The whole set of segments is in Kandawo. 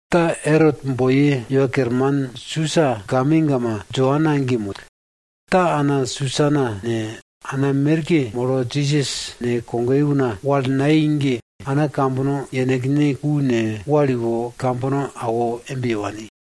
Ta Erot boiye iwa kerman Susa gamegama Joana ge moi. Ta ana Susana ne, ana merke molo Jisas ne, kogoye una wal nayei ge, ana kambono yenekne ku ne, wal iwo kambono awo embe ye wani.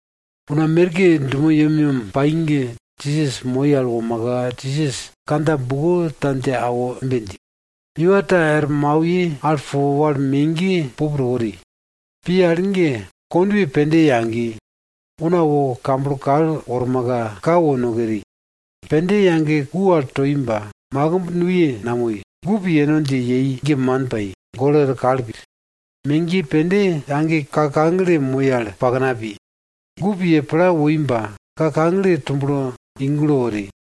Una merke dumo yemyem pai ge, Jisas moi al womaka, Jisas kandja buko ta dje awo embe dji, iwa ta er mauye al po wal megiye pup to wori. Pi al ge kondwe pende yagi. Una wo kamblo kal wormaka, ka wo no keri. Pende yage ku al toi ba, makimb nuye namoi. Gup yeno dje yei ge man pai, golo er kal pi. Megiye pende yage ka kagle moi al pakna pi. Gup ye pla woi ba, ka kagle tublo i gulo wori.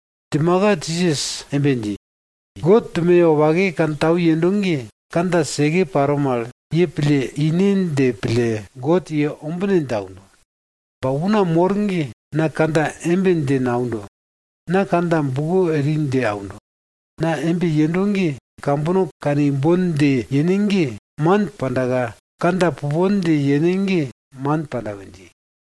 Djimaka Jisas embe dji, God dumoye wopake kantau yendo ge, kandja seke paro mal, ye pille ine dje pille God ye ombine dje aundo. Ba una mor ge na kandja embe dje naundo, na kandja buko eri dje aundo. Na embe yendo ge kambono kanimbon dje yene ge, man pandaka kandja pupon dje yene ge, man panda we dji.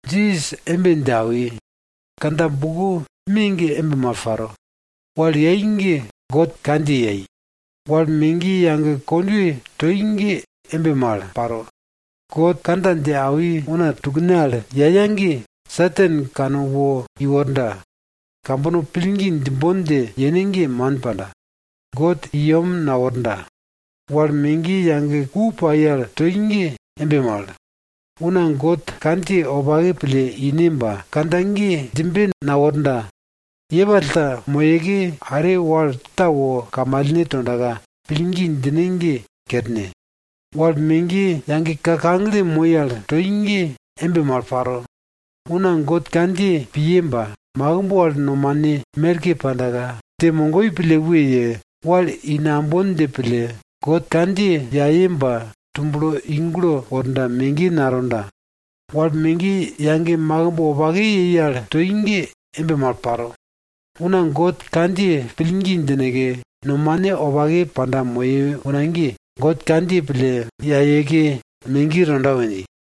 Jisas embe dje awi, kandja buko me ge embe mal paro. Wal yai ge God kandjiye yai. Wal megiye yage kondwe toi ge embe mal paro. God kandja dje awi una tukne al yaya ge, Satan kane wo iworda, kambono pillgi djimbon dje yene ge, man panda, God i yem naworda. Wal megiye yage ku pai al toi ge embe mal. Una God kandjiye wopake pille ine ba, kandja ge djimbe naworda. Yepall ta moyeke, are wal ta wo kamalne tondaka, pillgi djine ge kerne. Wal megiye yage ka kagle moi al toi ge embe mal paro. Una God kandjiye piye ba, makimb wal nomane merke pandaka, dje mogoi pille we ye, wal i nambon dje pille, God kandjiye yaye ba tublo i gulo worda, megiye natonda. Wal megiye yage makimb wopake yei al toi ge embe mal paro. Una God kandjiye pillgi djineke, nomane wopake panda moye una ge, God kandjiye pille yayeke megiye tonda we dji.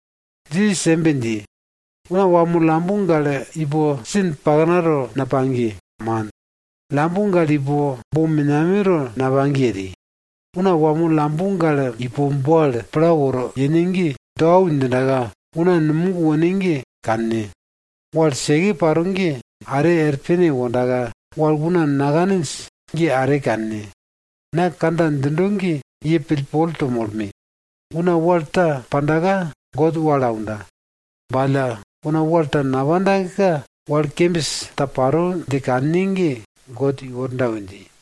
Jisas embe dji, una wamo lambo gale ipo sin paknato napagye, man. Lambo gale ipo bo menameto napagye eri. Una wamo lambo gale ipo bo al pla woro yene ge, do au djindaka una numog wone ge kanne. Wal seke paro ge are er pene wondaka, wal una nakaninj ge are kanne. Na kandja djindo ge ye pillpol to molme! Una wal ta pandaka God wal aunda. Ba alla, una wal ta napandaka, wal kembis ta paro dje kanne ge God iworda we dji.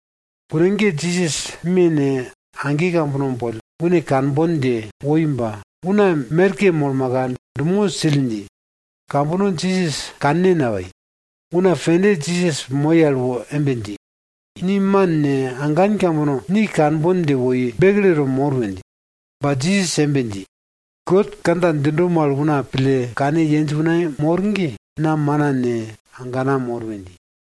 Kune ge Jisas me ne, age kambono une kanbon dje woi ba, una merke molmaka, dumo sill dji, kambono Jisas kanne napai. Una pende Jisas moi al wo embe dji, ni man ne, agan kambono ni kanbon dje woi, bekleto mor we dji. Ba Jisas embe dji, God kandja djindo mal una pille kane yenj una mor ge, na mana ne, agana mor we dji.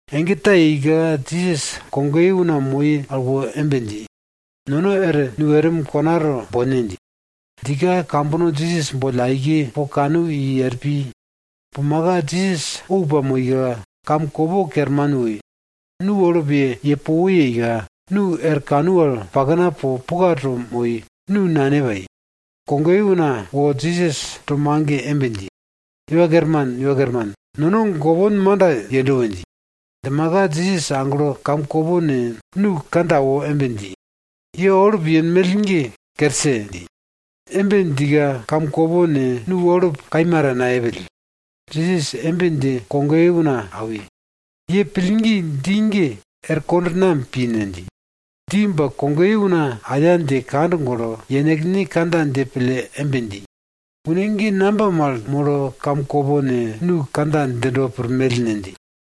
Ege ta yeika, Jisas kogoye una moi al wo embe dji, nono er nu erim konato bone dji. Djika kambono Jisas boll aike po kanu i er pi. Pumaka Jisas ou pamoika, kamkopo kerman woi. Nu olup ye po wo yeika, nu er kanu al pakna po puka to moi, nu nane pai. Kogoye una wo Jisas to mage embe dji, Iwa Kerman! Iwa Kerman! Nono gopon manda yendo we dji. Djimaka Jisas aglo kamkopo ne, nu kandja awo embe dji, ye olup yenmell ge kerse! dji. Embe djika kamkopo ne, nu olup kaima ta nayepill. Jisas embe dje kogoye una awi, ye pillgine ge, er dje pi? Dji ba kogoye una aya dje kand golo, yenekne kandja dje pille embe dji, une ge ne mal molo, kamkopo ne, nu kandja djindo pirmell ne? dji.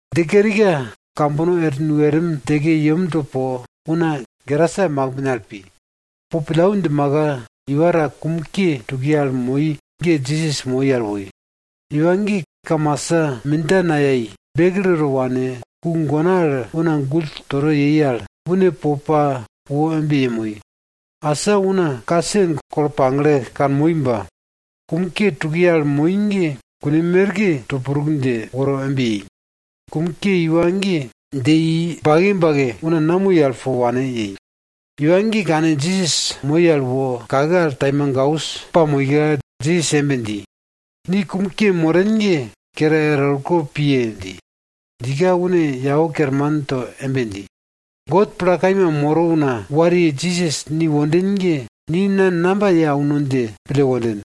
Dje kerika kambono er nu erim djeke yemto po, una Gerasa makimbne al pi. Po pillau djimaka, iwa ta kum ke tukiye al moi ge Jisas moi al woi. Iwa ge kamasa mindja nayai bekleto wane, ku gona al una gull toto yei al, une po pa wo embe yemoi. Asa una ka sen kolo pagle kanmoi ba, kum ke tukiye al moi ge kune merke to pruk dje woro embe yei. Kum ke iwa ge dje i bake bake una namoi al po wane yei. Iwa ge kane Jisas moi al wo kake al taimagaus pamoika, Jisas embe dji, ni kum ke moren ge kere erwo orko piye! dji. Djika, une yau kerman to embe dji, God pla kaima moro una wariye Jisas ni wonden ge, ni na namba ye auno dje pille wonden?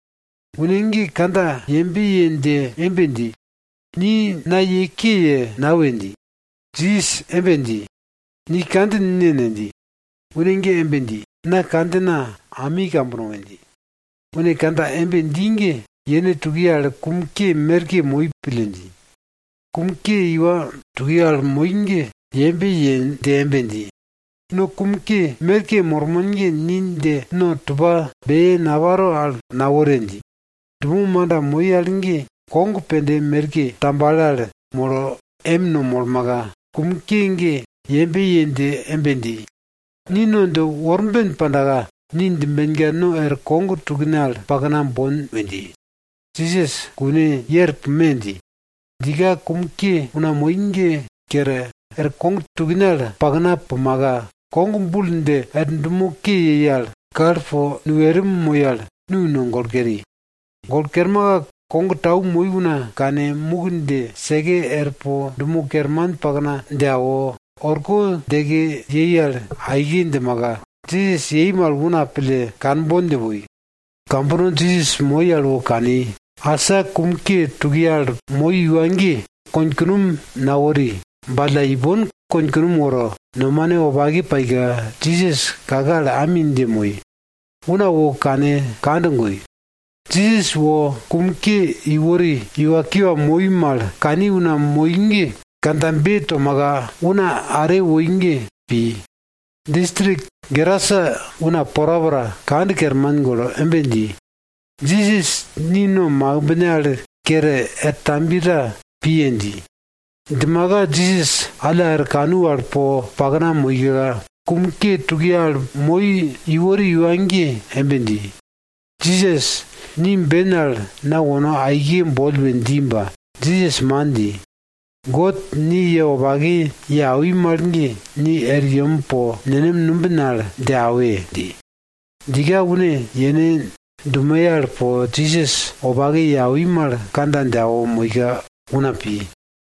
Une ge kandja yembe ye dje embe dji, ni na ye ke ye nawe! dji. Jisas embe dji, ni kandjin ne ne? dji. Une ge embe dji, na kandjina ami kambono we dji. Une kandja embe dji ge yene tukiye al kum ke merke moi pille dji. Kum ke iwa tukiye al moi ge yembe ye dje embe dji, no kum ke merke mormon ge, ni dje no tupa beye naparo al nawore! dji. Dumo manda moi al ge kog pende merke tambale al molo em no molmaka, kum ke ge yembe ye dje embe dji, ni no dje worben pandaka, ni djimbenka no er kog tukne al pakna bon we dji. Jisas, kune, ye er pume! dji. Djika kum ke una moi ge kere, er kog tukne al pakna pumaka, kog bul dje er dumo ke yei al kal po nu erim moi al, nu no golo keri. Golo kermaka kog tau moi una kane, muk dje seke er po dumo kerman paknato dje awo, orko djeke para aike djimaka, Jisas yei mal una pille kanbon dje woi. Kambono Jisas moi al wo kani, asa kum ke tukiye al moi iwa ge, konkunom nawori ba alla, ipon konkunom woro, nomane wopake paika, Jisas kake al ami dje moi, una wo kane kand goi. Jisas wo kum ke iwori iwa ge, kiwa moi mal kani una, kandjabe tomaka una are woi ge pi. Distrik Gerasa una porapora kand kerman golo embe dji, Jisas, ni no makimbne kere er tambiye ta piye! dji. Djimaka Jisas alla er kanu al po pakna moika, kum ke tukiye al moi iwori iwa ge embe dji, Jisas, ni ben al na wono aike boll we dji ba, Jisas man dji. God ni ye wopake ye awi mal ge, ni er yem po nenem numbin al dje awe! dji. Djika une yene dumoye al po Jisas wopake ye awi mal kandja dje awo moika una pi.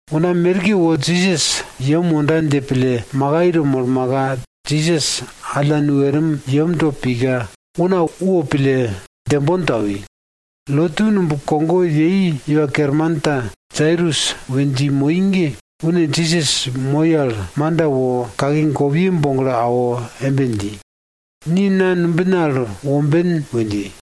Una merke wo Jisas yem wonda dje pille makai to molmaka, Jisas alla nu erim yemto pika, una wopille djembon to awi. Lotu numb kogo yei iwa kerman ta Jairus we dji moi ge, une Jisas woi al manda wo kake gopiye boglo awo embe dji, ni na numbina al womben we dji.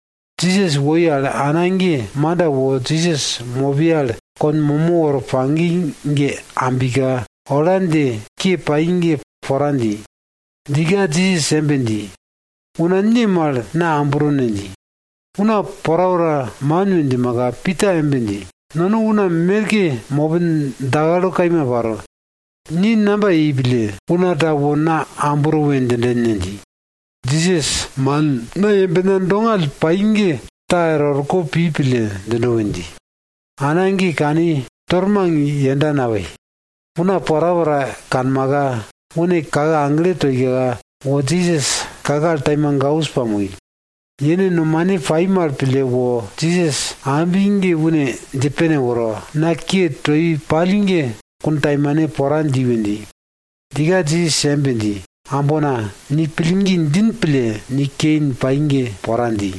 Jisas woi al ana ge manda wo Jisas mopiye al kon momo woro pagi ge ambika, ola dje ke pai ge pora dji. Djika Jisas embe dji, una ne mal na ambro ne? dji. Una porapora man we djimaka, Pita embe dji, nono una merke mopin dakalo kaima paro, ni namba yei pille, una ta wo na ambro we djinden ne? dji. Jisas, man, na yembena dongall pai ge ta er orko pi pille djindo we dji. Ana ge kani, tormang yenda napai, una porapora kanmaka, une kake agle toika, wo Jisas kake al taimagaus pa, yene nomane pai mal pille wo Jisas ambi ge une dje pene woro, na ke toi pall ge kuntaimane pora dji we dji. Djika Jisas embe dji, ambona, ni pillgi djin pille ni kein pai ge pora dji.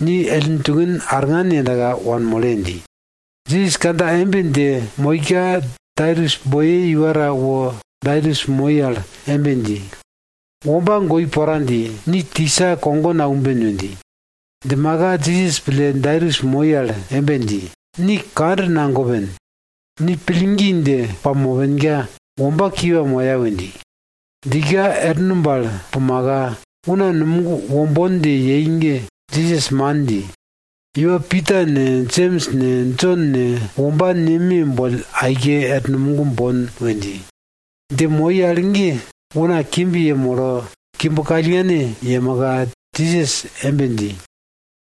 Ni ellin tukin arngan yendaka, wanmole! dji. Jisas kandja embe dje moika, Jairus boiye iwa ta wo Jairus moi al embe dji, womba goi pora dji. Ni tisa kogo naumben! we dji. Djimaka Jisas pille Jairus moi al embe dji, ni kand nagopen. Ni pillgi dje pamopenka, womba kiwa moya we dji. Djika er numb al pumaka, una numog wombon dje yei ge Jisas man dji. Une Pita ne, Jems ne, Jon ne, womba neme boll aike er numog bon we dji. Dje moi al ge una kimb yemolo, kimb kallngane yemaka, Jisas embe dji,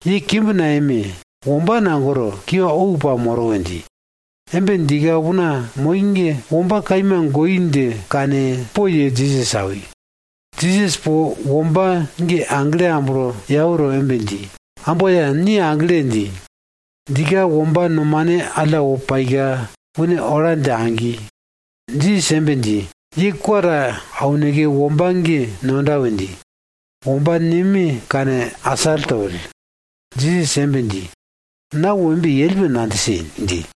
ye kimb nayeme! Womba nagoro, kiwa ou pamoro we dji. Embe djika una moi ge, womba kaima goi dje kane, poye Jisas awi. Jisas po womba ge agle amblo yau to embe dji, amboya! Ni agle! dji. Djika womba nomane alla wo paika, une ola dje agi. Jisas embe dji, ye kwa ta auneke womba ge nonda we dji. Womba neme kane asall topill. Jisas embe dji, na wo embe yell, we nadjise! dji.